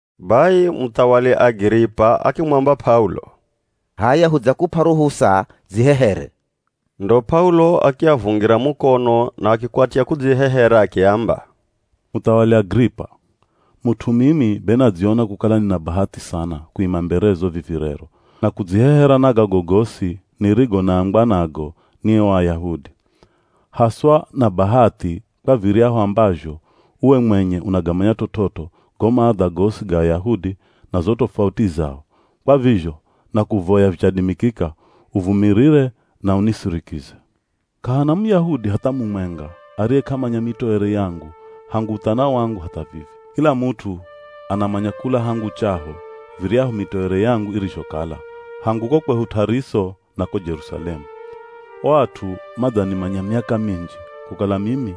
Bai muthawali Agiripa akimwamba P'aulo, “H'aya hudzakup'a ruhusa, dzihehere.” Ndo P'aulo akiavungira mukono na akikwatya kudzihehera akiamba, “Muthawali Agiripa, mut'u mimi be nadziona kukala nina bahathi sana kuima mberezo vivi rero na kudzihehera na gago gosi nirigo naambwa nago ni o Ayahudi. Haswa na bahathi kwa viryahu ambazho uwe mwenye unagamanya t'ot'ot'o go maadha gosi ga Ayahudi na zo tofauti zao, kwa vizho nakuvoya vichadimikika uvumirire na unisirikize. “K'ahana Muyahudi hatha mumwenga ariye k'amanya mitoere yangu hangu uthana wangu hatha vivi. Kila mut'u anamanya kula hangu chaho viryahu mitoere yangu irizhokala, hangu ko kwehu T'ariso na ko Jerusalemu. O at'u madzanimanya miaka minji kukala mimi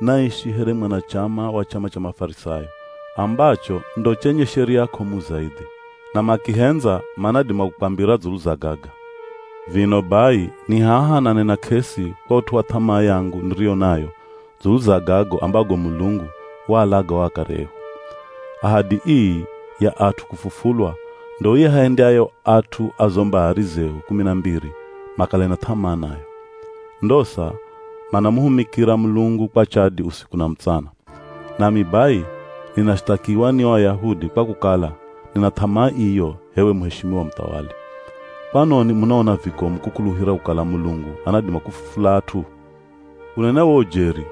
naishi here mwanachama wa chama cha Mafarisayo, ambacho ndo chenye sheria k'omu zaidhi. Na makihendza manadima kukwambira dzulu za gaga. Vino bai ni haha nanena k'esi kwa ut'u wa th'amaa yangu niriyo nayo dzulu za gago ambago Mulungu waalaga o akare ehu. Ahadi ii ya at'u kufufulwa ndo iahendyayo at'u a zo mbari zehu kumi na mbiri, makale na th'amaa nayo. Ndosa manamuhumikira Mulungu kwa chadi usiku na mutsana. Nami bai ninashithakiwa ni o Ayahudi kwa kukala nina th'amaa iyo h'ewe muheshimiwa Muthawali! Kwanoni munaona vikomu kukuluhira kukala Mulungu anadima kufufula at'u? “Kunena wo ujeri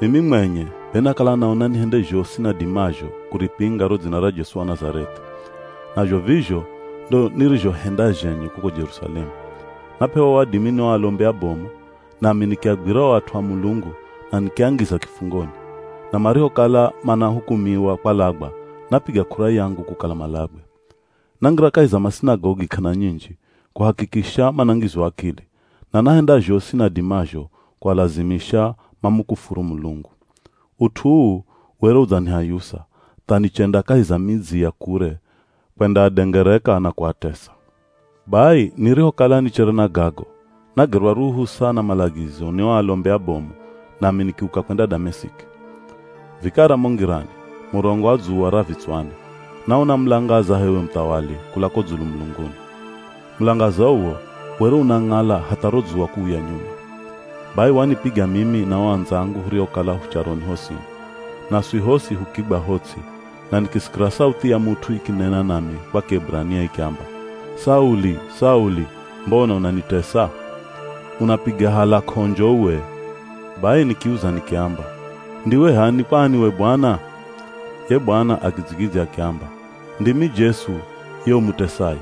mimi mwenye, be nakala naona nihende zhosi nadimazho kuripinga ro dzina ra Jesu wa Nazareth'i. Nazho vizho ndo nirizhohenda zhenye kuko Jerusalemu. Nap'ewa wadimi ni o alombi abomu nami nikiagwira o at'u a Mulungu na nikiangiza kifungoni, na marihokala manahukumiwa kwalagwa napiga k'ura yangu kukala malagwe. Nangira kahi za masinagogi k'ana nyinji kuhakikisha manangizwa akili, na nahenda zhosi nadimazho kualazimisha mamukufuru Mulungu. Ut'u uu were udzanihayusa tha nichenda kahi za midzi ya kure kwendaadengereka na kuatesa. Bai nirihokala nichere na gago, nagerwa ruhusa na malagizo ni o alombi abomu nami nikiuka kwenda Damesiki. Vikara mo ngirani, murongo wa dzuwa ra vitswani, naona mulangaza h'ewe muthawali kula ko dzulu mulunguni. Mulangaza uwo were unang'ala hatha ro dzuwa kuuya nyuma. Bai wanipiga mimi na o andzangu huriokala hu charoni hosini. Naswi hosi hukigwa ho ts'i na nikisikira sauthi ya mut'u ikinena nami kwa Kieburania ikiamba, ‘Sauli! Sauli mbona unanitesa? Unapiga hala k'onjo uwe.’ Bai nikiuza nikiamba, ‘Ndiwe h'ani kwani we Bwana?’ Ye Bwana akidzigidzya akiamba, ‘Ndimi Jesu, ye umutesaye.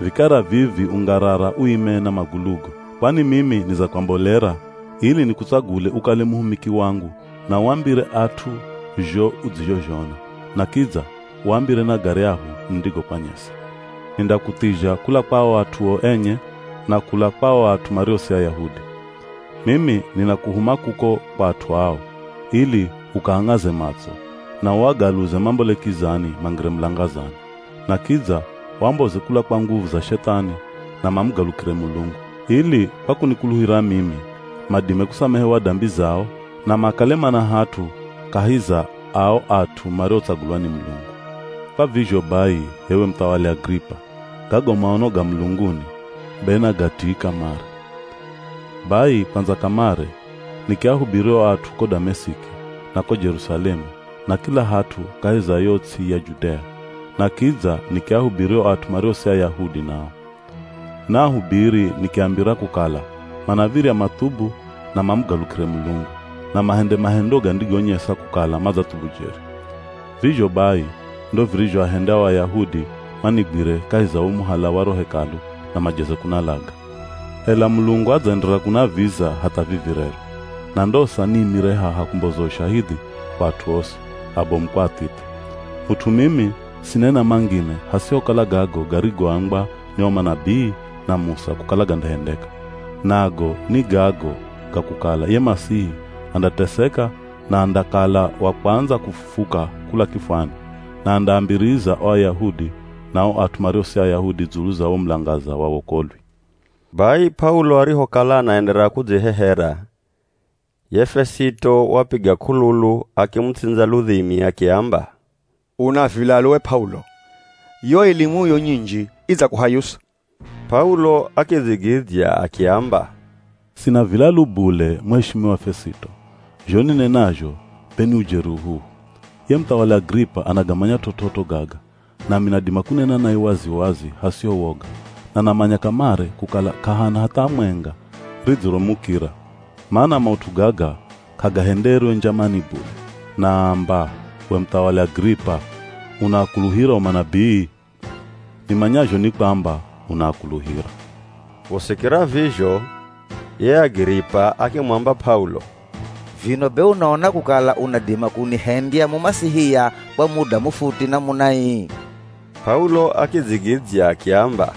Vikara vivi ungarara uime na magulugo. Kwani mimi nidzakwambolera ili nikutsagule ukale muhumiki wangu na uambire at'u zho udzizhozhona, na kidza uambire na garyahu nindigokwanyesa. Nindakuthizha kula kwa ao at'uo enye na kula kwa o at'u mario si Ayahudi. Mimi ninakuhuma kuko kwa at'u ao, ili ukaang'aze matso, na uagaluze mambole kizani mangire mulangazani, na kidza uamboze kula kwa nguvu za Shethani na mamugalukire Mulungu, ili kwa kunikuluhira mimi madime kusamehewa dambi zao na makale mana hat'u kahi za ao at'u mariotsagulwa ni Mulungu.’ “Kwa vizho bai h'ewe Muthawali Agiripa gago maono ga mulunguni be nagatii kamare. Bai kwandza kamare nikiahubiri o at'u ko Damesiki, na ko Jerusalemu na kila hat'u kahi za yo ts'i ya Judea, na kidza nikiahubiri o at'u mario si Ayahudi nao. Naahubiri nikiambira kukala manav̱irya mathubu na mamugalukire Mulungu, na mahende mahendo gandigonyesa kukala madzathubu jeri. Vizho bai ndo virizhoahenda o Ayahudi manigwire kahi za wo muhala wa ro Hekalu na majeze kunalaga. Ela Mulungu adzaenderera kunaviza hatha vivi rero, na ndosa niimire haha kumboza ushahidhi kwa at'u osi, abomu kwa athithe. Mut'u mimi sinena mangine, hasihokala gago garigoambwa ni o manabii na Musa kukala gandahendeka, nago ni gago ga kukala ye Masihi andateseka na andakala wa kwandza kufufuka kula kifwani, na andaambiriza o Ayahudi na o at'u mario si Ayahudi dzulu za wo mulangaza wa wokolwi.” Bai P'aulo arihokala anaenderera kudzihehera, ye Fesito wapiga k'ululu akimutsindza ludhimi akiamba, “Una vilalu we P'aulo! Yo elimuyo nyinji idzakuhayusa!” P'aulo akidzigidzya akiamba, “Sina vilalu bule, muheshimiwa Fesito zho ninenazho be ni ujeri uhuhu. Ye Muthawali Agiripa anagamanya t'ot'ot'o gaga nami nadima kunena naye wazi-wazi hasiho woga, na namanya kamare kukala k'ahana hatha mwenga ridziromukira, mana maut'u gaga k'agahenderwe njamani bule. Naamba, we muthawali Agiripa unaakuluhira o manabii? Nimanyazho ni kwamba unaakuluhira.” Kusikira vizho ye Agiripa akimwamba P'aulo, “Vino be unaona kukala unadima kunihendya Mumasihia kwa muda mufuti namuna ii?” P'aulo akidzigidzya akiamba,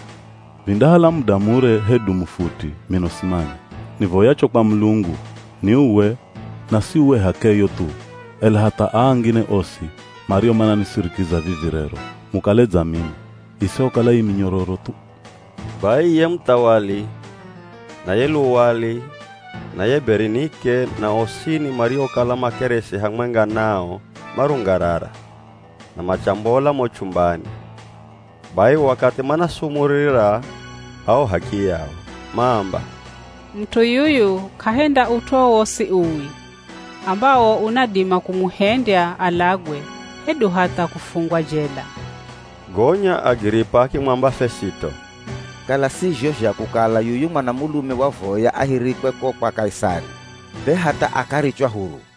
“Vindahala muda mure hedu mufuti mino simanya. Nivoyacho kwa Mulungu ni uwe, na si uwe h'akeyo thu, ela hatha aa angine osi mario mananisirikiza vivi rero mukale dza mimi, isihokala ii minyororo thu.” Bai ye muthawali, na ye luwali, na ye Berinike na osini mariokala makeresi hamwenga nao marungarara, na machambola mo chumbani, bai wakathi manasumurira ao h'akiyao, maamba, “Mut'u yuyu k'ahenda ut'u wowosi uwi ambawo unadima kumuhendya alagwe hedu hatha kufungwa jela.” Gonya Agiripa akimwamba Fesito, “Kala si zho zha kukala yuyu mwanamulume wavoya ahirikwe ko kwa Kaisari, be hatha akarichwa huru.”